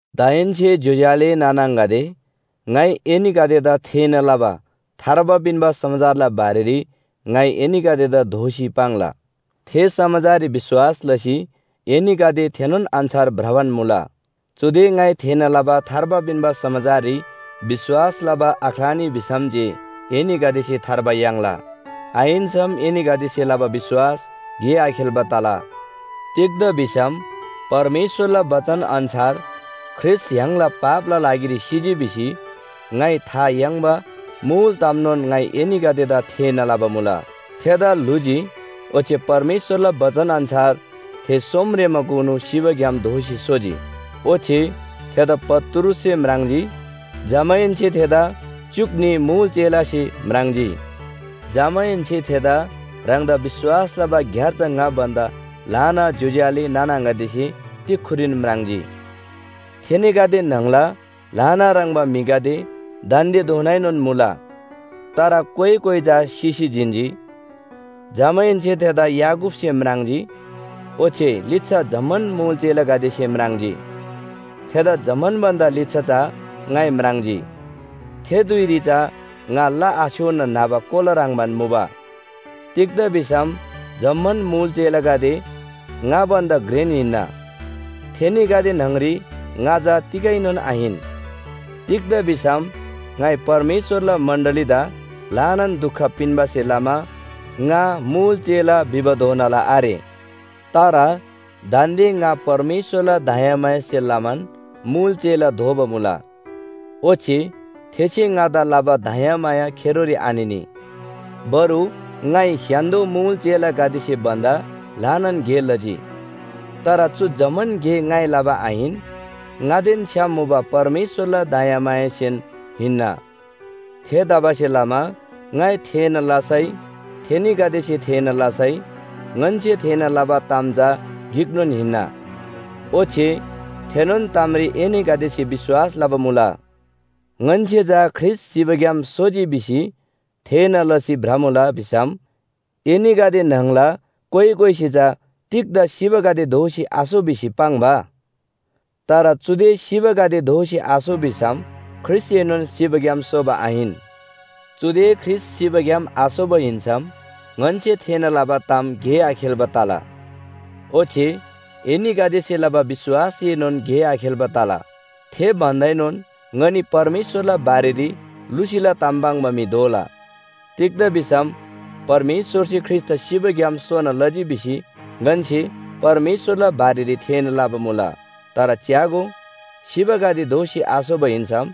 दाहेन्‍से ज्‍योज्‍यो आले नाना आङागदे, ङाइ एनीगदेदा थेःना लबा थार्बा पिन्‍बा समाचारला बारेरी ङाइ एनीगदेदा दोःसी पाङ्ला। थे समाचाररी विश्‍वास लसी एनीगदे थेनोन अन्‍छार भ्रबान मुला। चुदे ङाइ थेःना लबा थार्बा पिन्‍बा समाचाररी विश्‍वास लबा आख्‍लानी भिसम जे एनीगदेसे थार्बा याङ्ला, आहिन्‍सम एनीगदेसे लबा विश्‍वास गे आखेल्‍बा तला। तिग्‍दा भिसम परमेश्‍वरला बचन अन्‍छार ख्रीष्‍ट य्‍हाङला पापला लागिरी सिजी भिसी ङाइ था याङ्बा मुल तामनोन ङाइ एनीगदेदा थेःना लबा मुला। थेदा ल्‍हुजी ओच्‍छे परमेश्‍वरला बचन अन्‍छार थे सोमरेमाकुनु सिबाग्‍याम दोःसी सोजी। ओच्‍छे थेदा पत्रुससे म्राङ्जी, जमाहेन्‍से थेदा च्‍युक न्‍ही मुल चेलासे म्राङ्जी। जमाहेन्‍से थेदा ह्राङदा विश्‍वास लबा ग्‍यार्जा ङा भन्‍दा ल्‍हाना ज्‍योज्‍यो आले नाना आङागदेसे तिक्‍खुरीन म्राङ्जी। थेनीगदे न्‍हङला ल्‍हाना ह्रङ्‌बा म्‍हिगदे दान्‍देधोनाएनोन मुला, तर कोइ कोइ चा सिसी जिन्‍जी। जमाहेन्‍से थेदा याकूबसे म्राङ्जी, ओच्‍छे लिच्‍छा जम्‍मान मुल चेलागदेसे म्राङ्जी। थेदा जम्‍मान भन्‍दा लिच्‍छा चा ङाइ म्राङ्जी। थे धुइरी चा ङा ला आछ्‌योना न्‍हबा कोला ह्रङ्‌बान मुबा। तिग्‍दा भिसम जम्‍मान मुल चेलागदे ङा भन्‍दा घ्रेन हिन्‍ना, थेनीगदे न्‍हङरी ङा चा तिगैनोन आहिन। तिग्‍दा भिसम ङाइ परमेश्‍वरला मण्‍डलीदा ल्‍हानान दुख पिन्‍बासे लमा ङा मुल चेला भिबाधोनाला आरे। तर दान्‍दे ङा परमेश्‍वरला दयामायासे लमान मुल चेला दोबा मुला। ओच्‍छे थेसे ङादा लबा दयामाया खेरोरी आनिनी। बरु ङाइ स्‍य्‍हान्‍दो मुल चेलागदेसे भन्‍दा ल्‍हानान गे लजी। तर चु जम्‍मान गे ङाइ लबा आहिन, ङादेन छ्‌याम मुबा परमेश्‍वरला दयामायासेन हिन्‍ना। थेतबासेलमा ङाइ थेःना लसै, थेनीगदेसे थेःना लसै, ङन्‍से थेःना लबा ताम चा गिकनोन हिन्‍ना। ओच्‍छे थेनोन तामरी एनीगदेसे विश्‍वास लबा मुला। ङन्‍से चा ख्रीष्‍ट सिबाग्‍याम सोजी भिसी थेःना लसी भ्रमुला भिसम एनीगदे न्‍हङला कोइ कोइसे चा तिग्‍दा सिबागदे दोःसी आसो भिसी पाङ्बा? तर चुदे सिबागदे दोःसी आसो भिसम ख्रीष्‍टएनोन सिबाग्‍याम सोबा आहिन। चुदे ख्रीष्‍ट सिबाग्‍याम आसोबा हिन्‍सम ङन्‍से थेःना लबा ताम गे आखेल्‍बा तला, ओच्‍छे एनीगदेसे लबा विश्‍वासएनोन गे आखेल्‍बा तला। थे भन्‍दाएनोन ङनी परमेश्‍वरला बारेरी लुसीला ताम पाङ्बा म्‍हि दोला। तिग्‍दा भिसम परमेश्‍वरसे ख्रीष्‍टदा सिबाग्‍याम सोना लजी भिसी ङन्‍से परमेश्‍वरला बारेरी थेःना लबा मुला। तर च्‍यागो, सिबागदे दोःसी आसोबा हिन्‍सम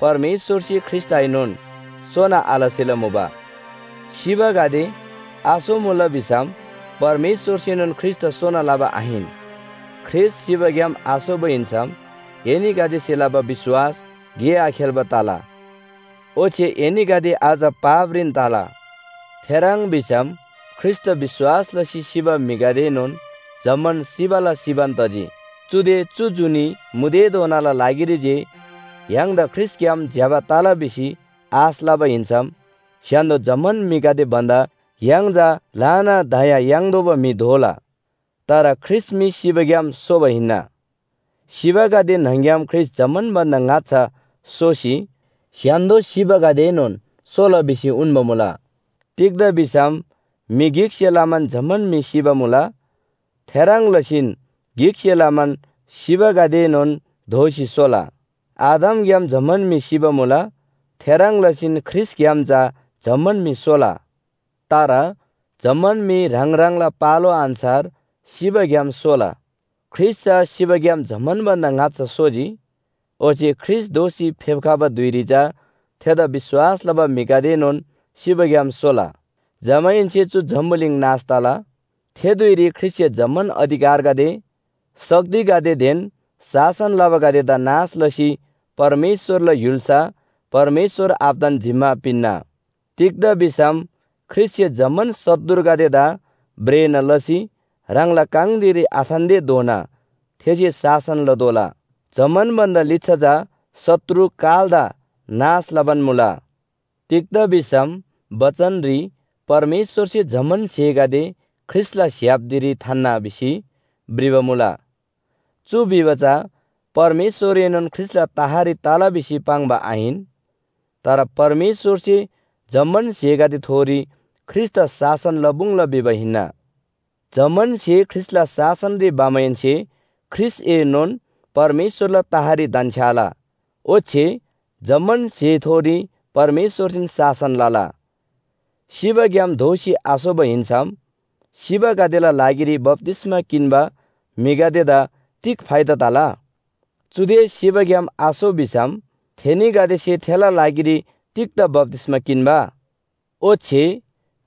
परमेश्‍वरसे ख्रीष्‍टदाएनोन सोना आलसेला मुबा। सिबागदे आसोमुला भिसम परमेश्‍वरसेनोन ख्रीष्‍टदा सोना लबा आहिन। ख्रीष्‍ट सिबाग्‍याम आसोबा हिन्‍सम एनीगदेसे लबा विश्‍वास गे आखेल्‍बा तला, ओच्‍छे एनीगदे अझ पापरीन तला। थेह्रङ् भिसम ख्रीष्‍टदा विश्‍वास लसी सिबा म्‍हिगदेएनोन जम्‍मान सिबाला सिबान तजी। चुदे चु जुनी मुदेधोनाला लागिरी जे य्‍हाङदा ख्रीष्‍टग्‍याम ज्‍यबा तला भिसी आश लबा हिन्‍सम स्‍य्‍हान्‍दो जम्‍मान म्‍हिगदे भन्‍दा य्‍हाङ चा ल्‍हाना दया याङ्तोःबा म्‍हि दोला। तर ख्रीष्‍ट मी सिबाग्‍याम सोबा हिन्‍ना। सिबागदे न्‍हङ‍ग्‍याम ख्रीष्‍ट जम्‍मान भन्‍दा ङाच्‍छा सोसी स्‍य्‍हान्‍दो सिबागदेएनोन सोला भिसी उन्‍बा मुला। तिग्‍दा भिसम म्‍हि गिकसे लमान जम्‍मान म्‍हि सिबा मुला। थेह्रङ् लसीन गिकसे लमान सिबागदेएनोन दोःसी सोला। आदमग्‍याम जम्‍मान म्‍हि सिबा मुला। थेह्रङ् लसीन ख्रीष्‍टग्‍याम चा जम्‍मान म्‍हि सोला। तर जम्‍मान म्‍हि ह्राङ ह्राङला पालो अन्‍छार सिबाग्‍याम सोला। ख्रीष्‍ट चा सिबाग्‍याम जम्‍मान भन्‍दा ङाच्‍छा सोजी। ओच्‍छे ख्रीष्‍ट दोःसी फेप्‍खबा धुइरी चा थेदा विश्‍वास लबा म्‍हिगदेएनोन सिबाग्‍याम सोला। जमाहेन्‍से चु जम्‍बुलिङ नाश तला। थे धुइरी ख्रीष्‍टसे जम्‍मान अधिकारगदे, शक्तिगदेदेन शासन लबागदेदा नाश लसी परमेश्‍वरला य्‍हुल्‍सा परमेश्‍वर आबादान जिम्‍मा पिन्‍ना। तिग्‍दा भिसम ख्रीष्‍टसे जम्‍मान शत्रुगदेदा भ्रेना लसी ह्राङला काङ धिरी आथान्‍तेधोना थेसे शासन लतोःला। जम्‍मान भन्‍दा लिच्‍छा चा शत्रु कालदा नाश लबान मुला। तिग्‍दा भिसम बचनरी “परमेश्‍वरसे जम्‍मान स्‍हेगदे ख्रीष्‍टला स्‍य्‍हाप धिरी थान्‍ना” भिसी भ्रिबा मुला। चु भिबा चा परमेश्‍वरएनोन ख्रीष्‍टला तहरी तला भिसी पाङ्बा आहिन। तर परमेश्‍वरसे जम्‍मान स्‍हेगदेथोरी ख्रीष्‍टदा शासन लपुङ्ला भिबा हिन्‍ना। जम्‍मान स्‍हे ख्रीष्‍टला शासनरी भमाहेन्‍से ख्रीष्‍टएनोन परमेश्‍वरला तहरी धन्‍छ्‌याला। ओच्‍छे जम्‍मान स्‍हेथोरी परमेश्‍वरसेन शासन लला। सिबाग्‍याम दोःसी आसोबा हिन्‍सम सिबागदेला लागिरी बप्‍तिस्‍मा किन्‍बा म्‍हिगदेदा तिग फाइदा तला? चुदे सिबाग्‍याम आसो भिसम थेनीगदेसे थेला लागिरी तिग्‍दा बप्‍तिस्‍मा किन्‍बा? ओच्‍छे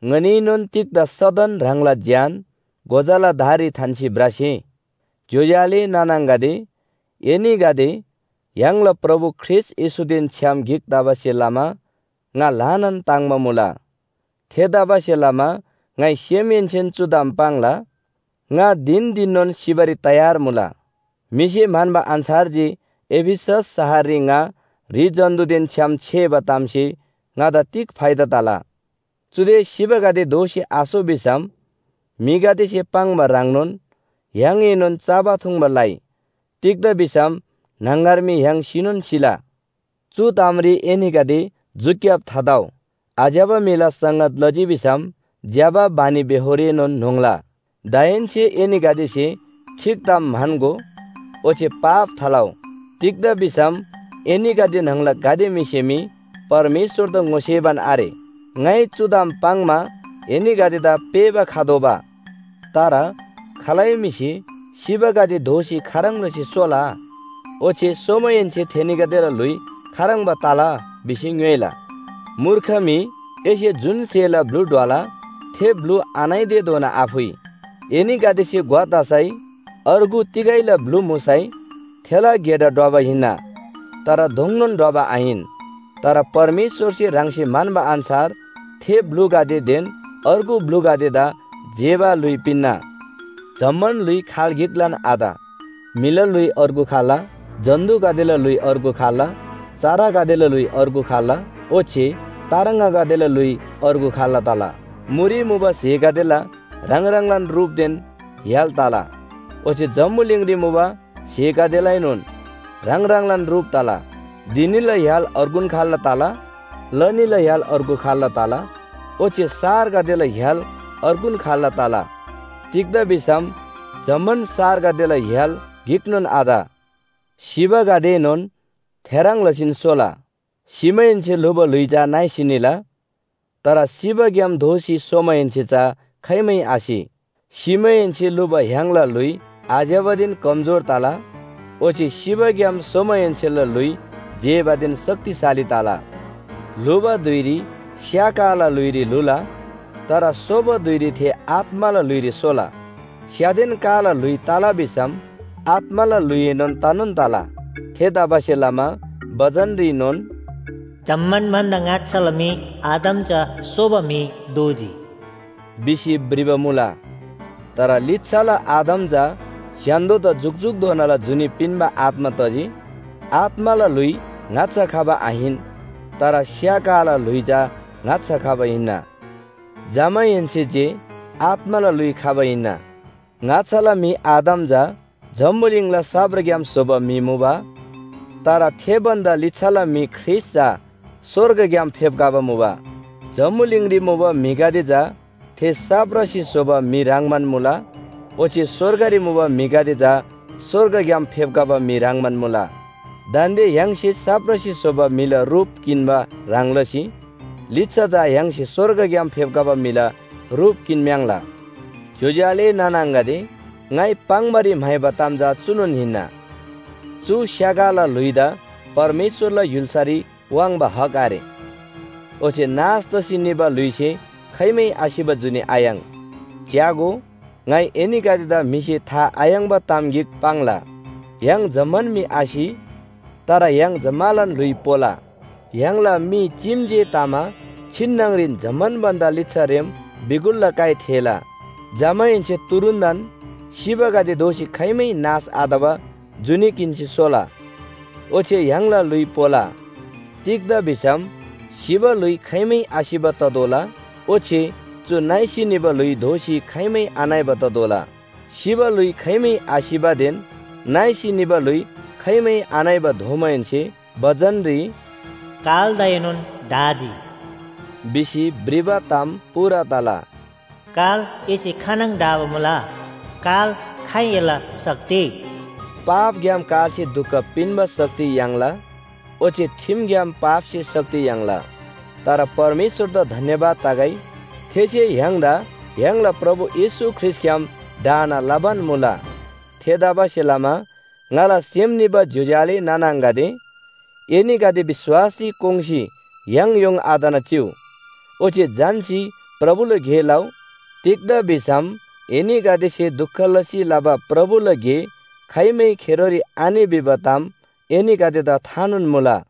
ङनीएनोन तिग्‍दा सदन ह्राङला ज्‍यान गोजाला धाररी थान्‍सी भ्रसे? ज्‍योज्‍यो आले नाना आङागदे, एनीगदे य्‍हाङला प्रभु ख्रीष्‍ट येशूदेन छ्‌याम गिक तबासे लमा ङा ल्‍हानान ताङ्‍बा मुला। थेतबासेलमा ङाइ सेमहेन्‍सेन चु ताम पाङ्ला, “ङा धिन धिननोन सिबारी तयार मुला।” म्‍हिसे म्‍हन्‍बा अन्‍छार जे एफिसस शहररी ङा ह्रि जन्‍तुदेन छ्‌याम छेबा तामसे ङादा तिग फाइदा तला? चुदे सिबागदे दोःसी आसो भिसम म्‍हिगदेसे पाङ्बा ह्रङ्नोन “य्‍हाङएनोन चबा थुङ्बा लइ, तिग्‍दा भिसम न्‍हङगर मी य्‍हाङ सिनोन सिला!” चु तामरी एनीगदे झ्‍युक्‍याब थातउ। आज्‍यबा म्‍हिला संगत लजी भिसम ज्‍यबा बानीबेहोरएनोन न्‍होङ्ला। दाहेन्‍से एनीगदेसे ठीक ताम म्‍हन्‍गो, ओच्‍छे पाप थालउ। तिग्‍दा भिसम एनीगदे न्‍हङला गाते म्‍हिसे मी परमेश्‍वरदा ङोसेबान आरे। ङाइ चु ताम पाङ्‌मा एनीगदेदा पेःबा खतोःबा। तर खालै म्‍हिसे “सिबागदे दोःसी खाह्रङ् लसी सोला? ओच्‍छे सोमाहेन्‍से थेनीगदेला ल्‍हुइ खाह्रङ्बा तला?” भिसी ङ्‌योइला। मूर्ख म्‍हि! एसे जुन स्‍हेला ब्‍लु ढ्वला थे ब्‍लु आनइतेधोना आफुइ। एनीगदेसे ग्‍वा तसै, अर्गु तिगैला ब्‍लु मुसै, थेला गेडा ढ्वबा हिन्‍ना, तर दोङनोन ढ्वबा आहिन। तर परमेश्‍वरसे ह्राङसे म्‍हन्‍बा अन्‍छार थे ब्‍लुगदेदेन अर्गु ब्‍लुगदेदा जेबा ल्‍हुइ पिन्‍ना। जम्‍मान ल्‍हुइ खाल गिकलान आत। म्‍हिला ल्‍हुइ अर्गु खाल्‍ला, जन्‍तुगदेला ल्‍हुइ अर्गु खाल्‍ला, चरागदेला ल्‍हुइ अर्गु खाल्‍ला ओच्‍छे तार्ङागदेला ल्‍हुइ अर्गु खाल्‍ला तला। मुरी मुबा स्‍हेगदेला ह्राङ ह्राङलान रुपदेन य्‍हाल तला ओच्‍छे जम्‍बुलिङरी मुबा स्‍हेगदेलाएनोन ह्राङ ह्राङलान रुप तला। धिनीला य्‍हाल अर्गुन खाल्‍ला तला, लनीला य्‍हाल अर्गु खाल्‍ला तला ओच्‍छे सारगदेला य्‍हाल अर्गुन खाल्‍ला तला। तिग्‍दा भिसम जम्‍मान सारगदेला य्‍हाल गिकनोन आत। सिबागदेएनोन थेह्रङ् लसीन सोला। सिमाहेन्‍से ल्‍हुबा ल्‍हुइ चा नइसी निला, तर सिबाग्‍याम दोःसी सोमाहेन्‍से चा खाइमै आसि। सिमाहेन्‍से ल्‍हुबा य्‍हाङला ल्‍हुइ आज्‍यबादेन कमजोर तला। ओच्‍छे सिबाग्‍याम सोमाहेन्‍सेला ल्‍हुइ जेबादेन शक्तिशाली तला। ल्‍हुबा धुइरी स्‍या काला ल्‍हुइरी ल्‍हुला, तर सोबा धुइरी थे आत्‍माला ल्‍हुइरी सोला। स्‍यादेन काला ल्‍हुइ तला भिसम आत्‍माला ल्‍हुइएनोन तनोन तला। थेतबासेलमा बचनरीनोन, “जम्‍मान भन्‍दा ङाच्‍छाला म्‍हि आदम चा सोबा म्‍हि दोजी” भिसी भ्रिबा मुला। तर लिच्‍छाला आदम चा स्‍य्‍हान्‍दोदा जुकजुकधोनाला जुनी पिन्‍बा आत्‍मा तजी। आत्‍माला ल्‍हुइ ङाच्‍छा खबा आहिन, तर स्‍या काला ल्‍हुइ चा ङाच्‍छा खबा हिन्‍ना। जमाहेन्‍से जे आत्‍माला ल्‍हुइ खबा हिन्‍ना। ङाच्‍छाला म्‍हि आदम चा जम्‍बुलिङला साप्राग्‍याम स्‍होबा म्‍हि मुबा। तर थे भन्‍दा लिच्‍छाला म्‍हि ख्रीष्‍ट चा स्‍वर्गग्‍याम फेप्‍खबा मुबा। जम्‍बुलिङरी मुबा म्‍हिगदे चा थे साप्रासे स्‍होबा म्‍हि ह्रङ्‌बान मुला, ओच्‍छे स्‍वर्गरी मुबा म्‍हिगदे चा स्‍वर्गग्‍याम फेप्‍खबा म्‍हि ह्रङ्‌बान मुला। दान्‍दे य्‍हाङसे साप्रासे स्‍होबा म्‍हिला रुप किन्‍बा ह्रङ् लसी लिच्‍छा चा य्‍हाङसे स्‍वर्गग्‍याम फेप्‍खबा म्‍हिला रुप किन्‍म्‍याङ्‌ला। ज्‍योज्‍यो आले नाना आङागदे, ङाइ पाङ्‌बारी म्‍हाइबा ताम चा चुनोन हिन्‍ना, चु स्‍या काला ल्‍हुइदा परमेश्‍वरला य्‍हुल्‍सारी वाङ्बा हक आरे। ओच्‍छे नाश तसी निबा ल्‍हुइसे खाइमै आसिबा जुनी आयाङ्। च्‍यागो, ङाइ एनीगदेदा म्‍हिसे था आयाङ्‍बा ताम गिक पाङ्ला। य्‍हाङ जम्‍मान मी आसि, तर य्‍हाङ जम्‍मालान ल्‍हुइ पोला। य्‍हाङला मी चीम जे तमा छिन्‍नङरीन जम्‍मान भन्‍दा लिच्‍छारेम बिगुलला काइ थेःला। जमाहेन्‍से तुरुन्‍तन सिबागदे दोःसी खाइमै नाश आतबा जुनी किन्‍सी सोला, ओच्‍छे य्‍हाङला ल्‍हुइ पोला। तिग्‍दा भिसम सिबा ल्‍हुइ खाइमै आसिबा ततोःला, ओच्‍छे चु नइसी निबा ल्‍हुइ दोःसी खाइमै आनइबा ततोःला। सिबा ल्‍हुइ खाइमै आसिबादेन नइसी निबा ल्‍हुइ खाइमै आनइबा दोमाहेन्‍से बचनरी “कालदाएनोन ढाजी” भिसी भ्रिबा ताम पूरा तला। “काल एसे खानङ ढाबा मुला? काल खाइ एला शक्ति?” पापग्‍याम कालसे दुख पिन्‍बा शक्ति याङ्ला ओच्‍छे ठिमग्‍याम पापसे शक्ति याङ्ला। तर परमेश्‍वरदा धन्‍यवाद तगै, थेसे य्‍हाङदा य्‍हाङला प्रभु येशू ख्रीष्‍टग्‍याम ढाना लबान मुला। थेतबासेलमा ङाला सेम निबा ज्‍योज्‍यो आले नाना आङागदे, एनीगदे विश्‍वासरी कोङ्‌सी याङयोङ आतना चिउ। ओच्‍छे झन्‍सी प्रभुला गे लउ। तिग्‍दा भिसम एनीगदेसे दुख लसी लबा प्रभुला गे खाइमै खेरोरी आनि भिबा ताम एनीगदेदा थानोन मुला।